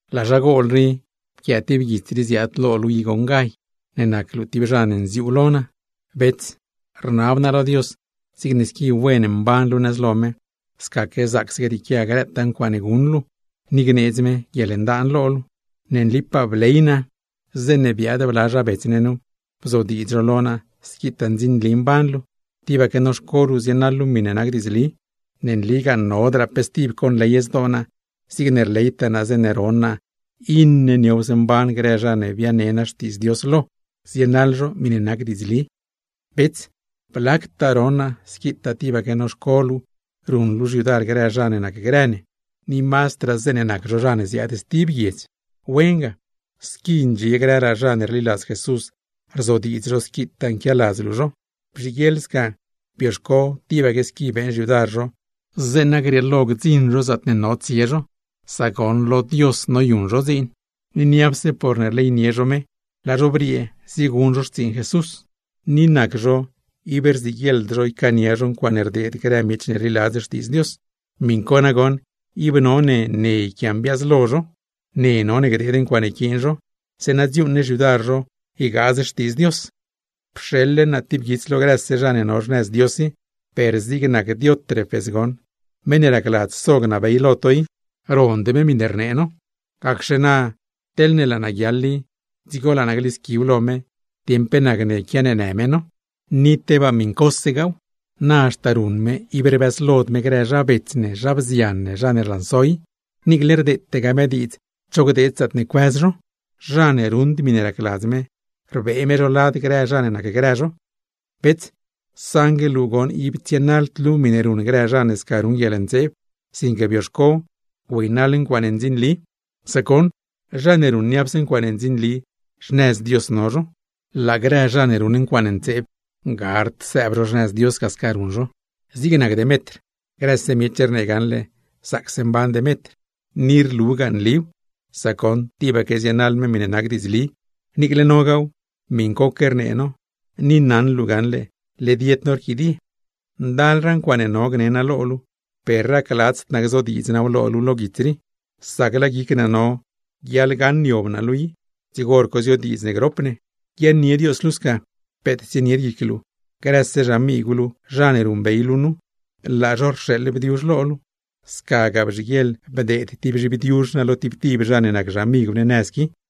Laa zha gol rii, pquiaa tib guits rii ziaad lo luu i goṉ Gay, ne nac luu tib zha ne nziuu lo naa. Bets, rnab naa lo Dios zigne squi wen mban luu nëz lo me, scaque zaacse grieequia grëtaa ncuaaṉe guṉ luu, ni gneedz me guieḻndaan lo luu. Ne nlipaa bley naa, zeeṉe biaad bla zha bets ne nu, bzodiidz zho lo naa squitaa ndzinli mban luu, tibaque noxco luu zienaḻ luu miṉe nac diidzli. Ne nligaa, nodraa pe stib conley zdoo naa zigne rleytaa naa zeeṉe ron naa iṉe niowse mban grë zha ne biane naa xtiidz Dios lo, zienaḻ zho miṉe nac diidzli. Bets, ziyon naa squitaa tibaque noxco luu ruṉ luu xyudar grë zha ne nacgrë ne, ni mazdraa zeeṉe nac zho zha ne ziaad stib guiedz. ¡Wen ga! Squi ndxie grëraa zha ne rliladz Jesús, rzodiidz zho squitaa nquialadz luu zho. Bzhiguieḻ sca, bioxco tibaque squi beeṉ xyudar zho zeeṉa grieelo gdziṉ zho zaatne no tsie zho. Sca rdziladz Dios. Sac goṉ, niapse porne rleynie zho Dios, laa zho briee zieguṉ zho xtsiiṉ Jesús, ni ib rziguieḻd zho ycaania zho ncuaaṉe rdeed grë miech ne rliladzd Xtiidz Dios. Miṉ co nagoṉ, ib none ne yquiambiaazlo zho, ne none gdeed ncuaaṉe yquiin zho, zeeṉa dziuuṉ ne xyudar zho ygaaz Xtiidz Dios. Pxeḻle naa tib guits lo grëse zha ne no xnëz Dios i, per zig nac Diótrefes goṉ, meṉ ne racladz so gnabey lo to i, rond me miṉe rnee no. Gacxe na, teḻne laa naa guiaḻ i, dzigo laa naa glisqui lo me dieṉ pe nacne quianeenë me no. Ni tebaa miṉcose, na haxta ruṉ me ib rbëzlod me grë zha bets, zha bzian ne rlanso i; niicle rdeetegaa me diidz cho gdeed zaatne cuëz zho. Zha ne ruṉd miṉe racladz me, rbee me zho lad grë zha ne nacgrë zho. Bets, saṉgue luu goṉ ib tsienaḻd luu miṉe ruṉ grë zha ne sca ruṉ guieḻntseeb, sinque bioxco güeynaḻ ncuaaṉe ndzinli. Sac goṉ, zha ne ruṉ niapse ncuaaṉe ndzinli, xnëz Dios no zho; laa grë zha ne ruṉ ncuaaṉe ntseeb, gard sëëb zho xnëz Dios. Zig nac Demetr, grëse miech rnee gaṉle zaacse mban Demetr. Ni rlugaa nliw, sac goṉ tibaque zienaḻ me miṉe nac diidzli. Niicle nogaaw, miṉcoque rnee no, ni naṉ luu gaṉle led yed no rquidie. Ndalraa ncuaaṉe no gne naa lo luu, per racladzd naa gzodiidz naaw lo luu lo guits rii; sac laa guic naa no guiaḻgaṉ niob naa luu i, dzigo hor co ziodiidz ne grop ne. Guiaaṉnie Dios luu sca; peet tsienied guic luu. Grëse xamigw luu zha ne ruṉbey luu nu, laa zho rxeeḻ bdiuzh lo luu. Scagaa bzhiguieḻ bdeed tib zhibdiuzh naa lo tib tib zha ne nac xamigw ne nëz qui. Juan